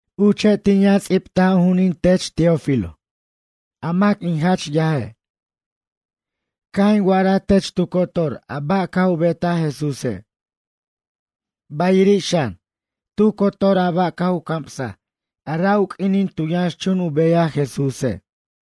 Uche' tin yʌn ts'ibtaj u ju'unin tech Teófilo, a mac in jach yaje'. Caj in wa'araj tech tu cotor a ba' caj u betaj Jesúse'. Bayiri' xan, tu cotor a ba' caj u camsaj a ra' u q'uinin tu yʌnxchun u beyaj Jesúse'.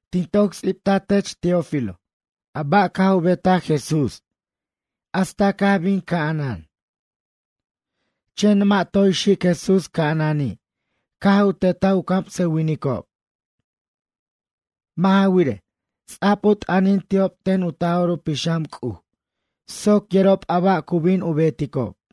Tin toc ts'ibtaj tech Teófilo a ba' caj u betaj Jesús hasta caj bin ca'anan. Chen mʌ' toy xic Jesús ca'anani', caj u tetaj u camsʌwinicob. Mʌ' ja wirej, ts'a'b u t'ʌnin ti'ob ten u Taj'or u Pixam C'uj soc yerob a ba' cu bin u beticob.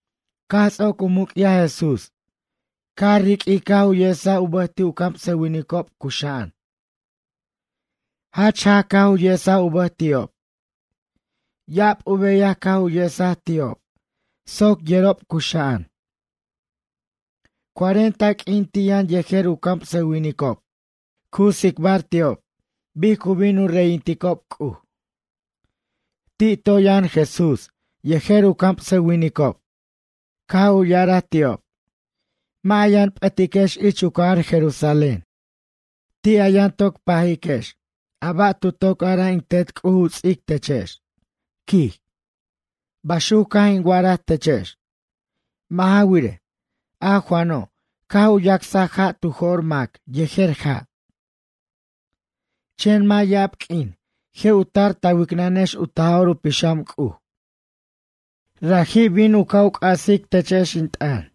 Caj ts'oc u muc'yaj Jesús, caj riq'uij caj u yesaj u bʌj ti' u camsʌwinicob cuxa'an. Jach jaj caj u yesaj u bʌj ti'ob. Ya'ab u beyaj caj u yesaj ti'ob soc yerob cuxa'an. Cuarenta q'uin ti' yʌn yejer u camsʌwinicob cu tsicbar ti'ob bic cu bin u reyinticob C'uj. Ti' toy yʌn Jesús yejer u camsʌwinicob caj u ya'araj ti'ob: ―Mʌ' a yʌn p'ʌtiquex ich u cajar Jerusalén. Ti' a yʌn toc pajiquex a ba' tu toc araj in Tet C'uj u ts'ic techex ―quij―. Baxuc caj in wa'araj techex. Mʌ' ja wirej, a Juano' caj u yacsaj ja' tu jo'r mac yejer ja'. Chen mʌ' ya'ab q'uin je' u tar ta wicnʌnex u Taj'or u Pixam C'uj. Raji' bin u ca' c'asiquex techex in t'ʌn.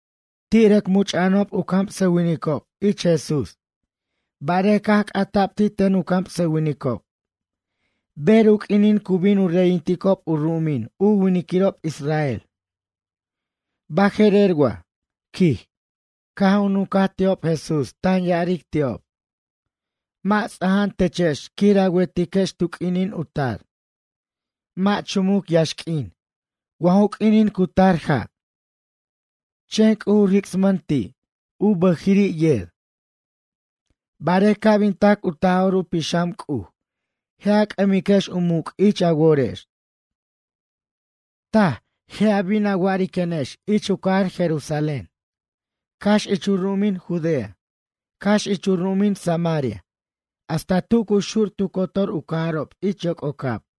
Ti' u rʌc much'a'anob u camsʌwinicob ich Jesús barej caj c'ata'b ti' ten u camsʌwinicob: ―Ber u q'uinin cu bin u reyinticob u ru'umin u winiquirob israel? Baje'rer wa? ―quij. Caj u nuncaj ti'ob Jesús tan ya'aric ti'ob: ―Mʌ' ts'aja'an techex quir a wetiquex tu q'uinin u tar. Mʌ' chumuc yaxq'uin, wa ju q'uinin cu tar ja'. Chen C'uj u ricsmʌn ti', u bʌjiri' yer. Barej ca' bin tac u Taj'or u Pixam C'uj, je' a c'ʌmiquex u muc' ich a worex. Taj je' a bin a wa'ariquenex ich u cajar Jerusalén, cax ich u ru'umin Judea, cax ich u ru'umin Samaria hasta tu cu xur tu cotor u cajarob ich yoc'ocab.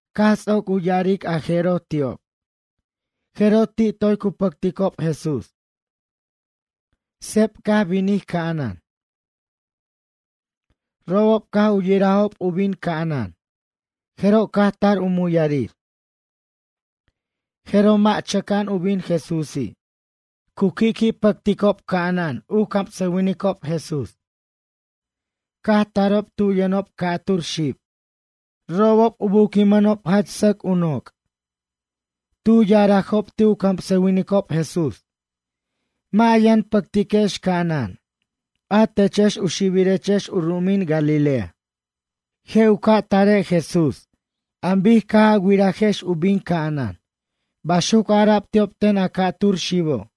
Caj ts'oc u ya'aric a jeroj ti'ob, jeroj ti' toy cu pʌcticob Jesús. Seb caj binij ca'anan. Robob caj u yirajob u bin ca'anan, jeroj caj tar u muyarir. Jeroj, mʌ' chʌca'an u bin Jesúsi'. Cu qui'qui' chanticob ca'anan u camsʌwinicob Jesús, caj tarob tu yʌnob ca'tur xib. Robob u buquimʌnob jach sʌc u noc'. Tu ya'arajob ti' u camsʌwinicob Jesús: ―Mʌ' a yʌn pʌctiquex ca'anan, a techex u xibirechex u ru'umin Galilea. Je' u ca' tare' Jesús an bic caj a wirajex u bin ca'anan ―baxuc ara'b ti'ob ten a ca'tur xibo'.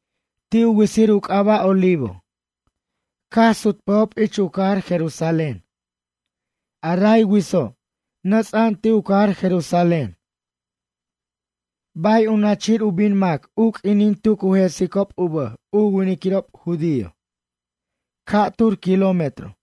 Ti' u witsir u c'aba' Olivo, caj sutpʌjob ich u cajar Jerusalén. A ray witso', nʌts'a'an ti' u cajar Jerusalén, bay u nachir u bin mac u q'uinin tu cu jesicob u bʌj u winiquirob judío. Ca'tur kilómetro.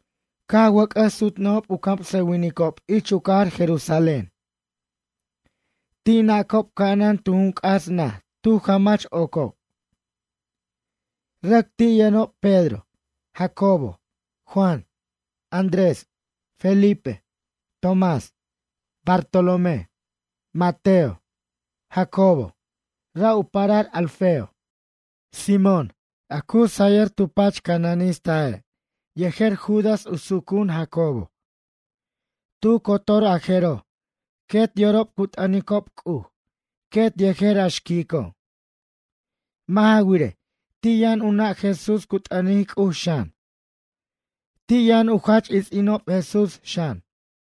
Caj wʌc'ʌs sutnʌjob u camsʌwinicob ich u cajar Jerusalén. Ti' nacob ca'anan tu jun c'as naj tu jamach ocob. Rʌc ti' yʌnob Pedro, Jacobo, Juan, Andrés, Felipe, Tomás, Bartalomé, Mateo, Jacobo, ra' u parar Alfeo. Simón, a cu sayʌr tu pach cananistaje' yejer Judas u sucu'un Jacobo. Tu cotor a jeroj quet yorob cu t'ʌnicob C'uj quet yejer a xquico'. Mʌ' ja wirej, ti' yʌn u nʌ' Jesús cu t'ʌnic C'uj xan. Ti' yʌn u jach its'inob Jesús xan.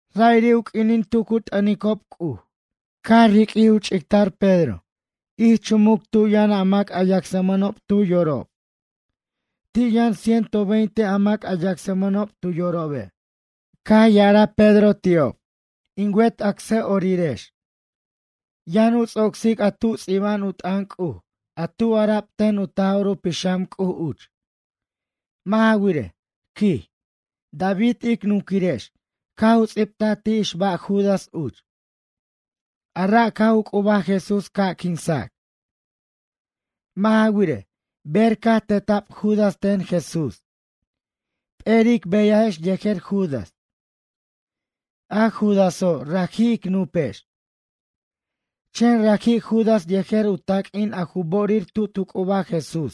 Ra'iri' u q'uinin tu cu t'ʌnicob C'uj, caj riq'uij u ch'ictar Pedro ich chumuc tu yʌn a mac a yacsmʌnob tu yorob. Ti' yʌn ciento veinte a mac a yacsmʌnob tu yorobe'. Caj ya'araj Pedro ti'ob: ―In wet acsa'orirex, yʌn u ts'ocsic a tu ts'iba'an u t'ʌn C'uj a tu ara'b ten u Taj'or u Pixam C'uj uch. Mʌ' ja wirej ―quij―, David ic nunquirex caj u ts'ibtaj ti' ixba' Judas uch, a ra' caj u c'ubaj Jesús ca' quinsac. Mʌ' ja wirej, ber caj teta'b Judas ten Jesús, p'eri' ic beyajex yejer Judas. A Judaso' raji' ic nupex. Chen raji' Judas yejer u taq'uin a ju bo'orir tu tu c'ubaj Jesús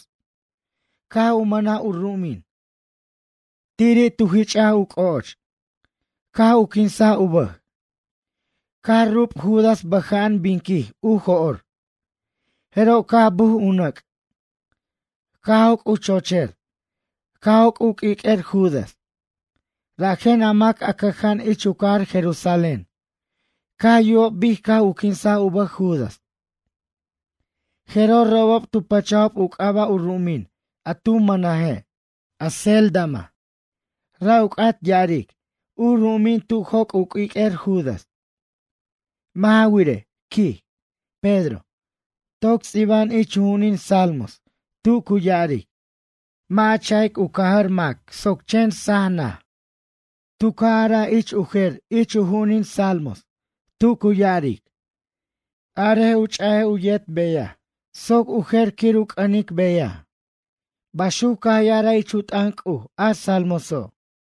caj u mʌnaj u ru'umin. Tiri' tu jich'aj u c'o'och, caj u quinsaj u bʌj. Caj rub Judas bʌja'an binquij u jo'r. Jeroj caj buj u nʌc', caj joc' u chocher, caj joc' u q'uiq'uer Judas. Rajen a mac a cʌja'an ich u cajar Jerusalén caj yubob bic caj u quinsaj u bʌj Judas, jeroj robob tu pʌchajob u c'aba' u ru'umin a tu mʌnaje', Acéldama, ra' u c'at ya'aric, u ru'umin tu joc' u q'uiq'uer Judas. Mʌ' ja wirej ―quij Pedro―, toc ts'iba'an ich u ju'unin salmos tu cu ya'aric: “Mʌ' a cha'ic u cajʌr mac soc chen saj nʌj.” Tu ca' araj ich u jer ich u ju'unin salmos, tu cu ya'aric: “Arej u ch'aj u yet beyaj soc u jer quir u c'ʌnic beyaj”, baxuc caj ya'araj ich u t'ʌn C'uj a salmoso'.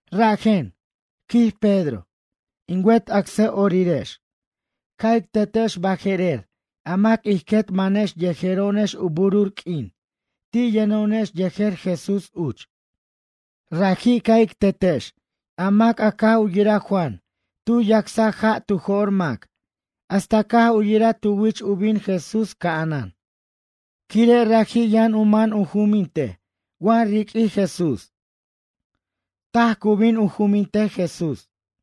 ’Rajen ―quij Pedro―, in wet acsa'orirex ca' ic tetex baje'rer a mac ij quet manex yejero'onex u burur q'uin ti' yʌno'onex yejer Jesús uch. Raji' ca' ic tetex a mac a caj u yiraj Juan tu yacsaj ja' tu jo'r mac hasta caj u yiraj tu wich u bin Jesús ca'anan, quire' raji' yʌn u man u jumintej wa riq'uij Jesús. Taj cu bin u jumintej Jesús.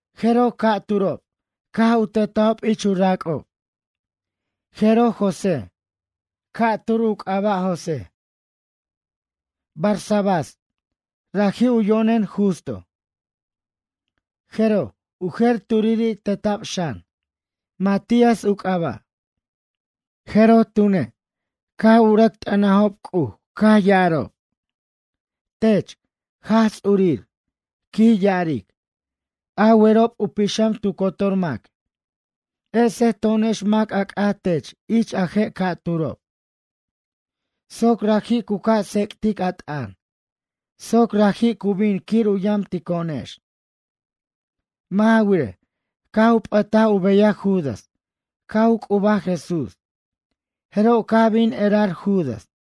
Jeroj ca'turob caj u tetajob ich u rac'ob. Jeroj José, ca'p'er u c'aba' José, Barsabás, raji' u yo'nen Justo. Jeroj u jer turiri' teta'b xan, Matías u c'aba'. Jeroj tune', caj u rʌc t'ʌnajob C'uj caj ya'arob: ―Tech, Jaj Ts'urir ―quij ya'aric―. A werob u pixam tu cotor mac, ese to'onex mac a c'at tech ich a je' ca'turob. Soc raji' cu ca' tsec'tic a t'ʌn soc raji' cu bin quir u yamtico'onex. Mʌ' ja wirej, caj u p'ʌtaj u beyaj Judas caj u c'ubaj Jesús, jeroj caj bin erar Judas.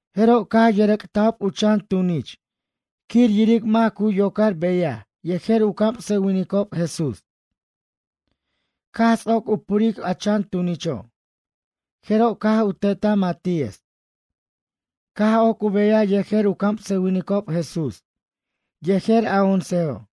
Jeroj caj yʌrʌc'tajob u chan tunich quir yiric mac cu yocar beyaj yejer u camsʌwinicob Jesús. Caj ts'oc u puric a chan tunicho', jeroj caj u tetaj Matías. Caj oc u beyaj yejer u camsʌwinicob Jesús, yejer a oncejo'.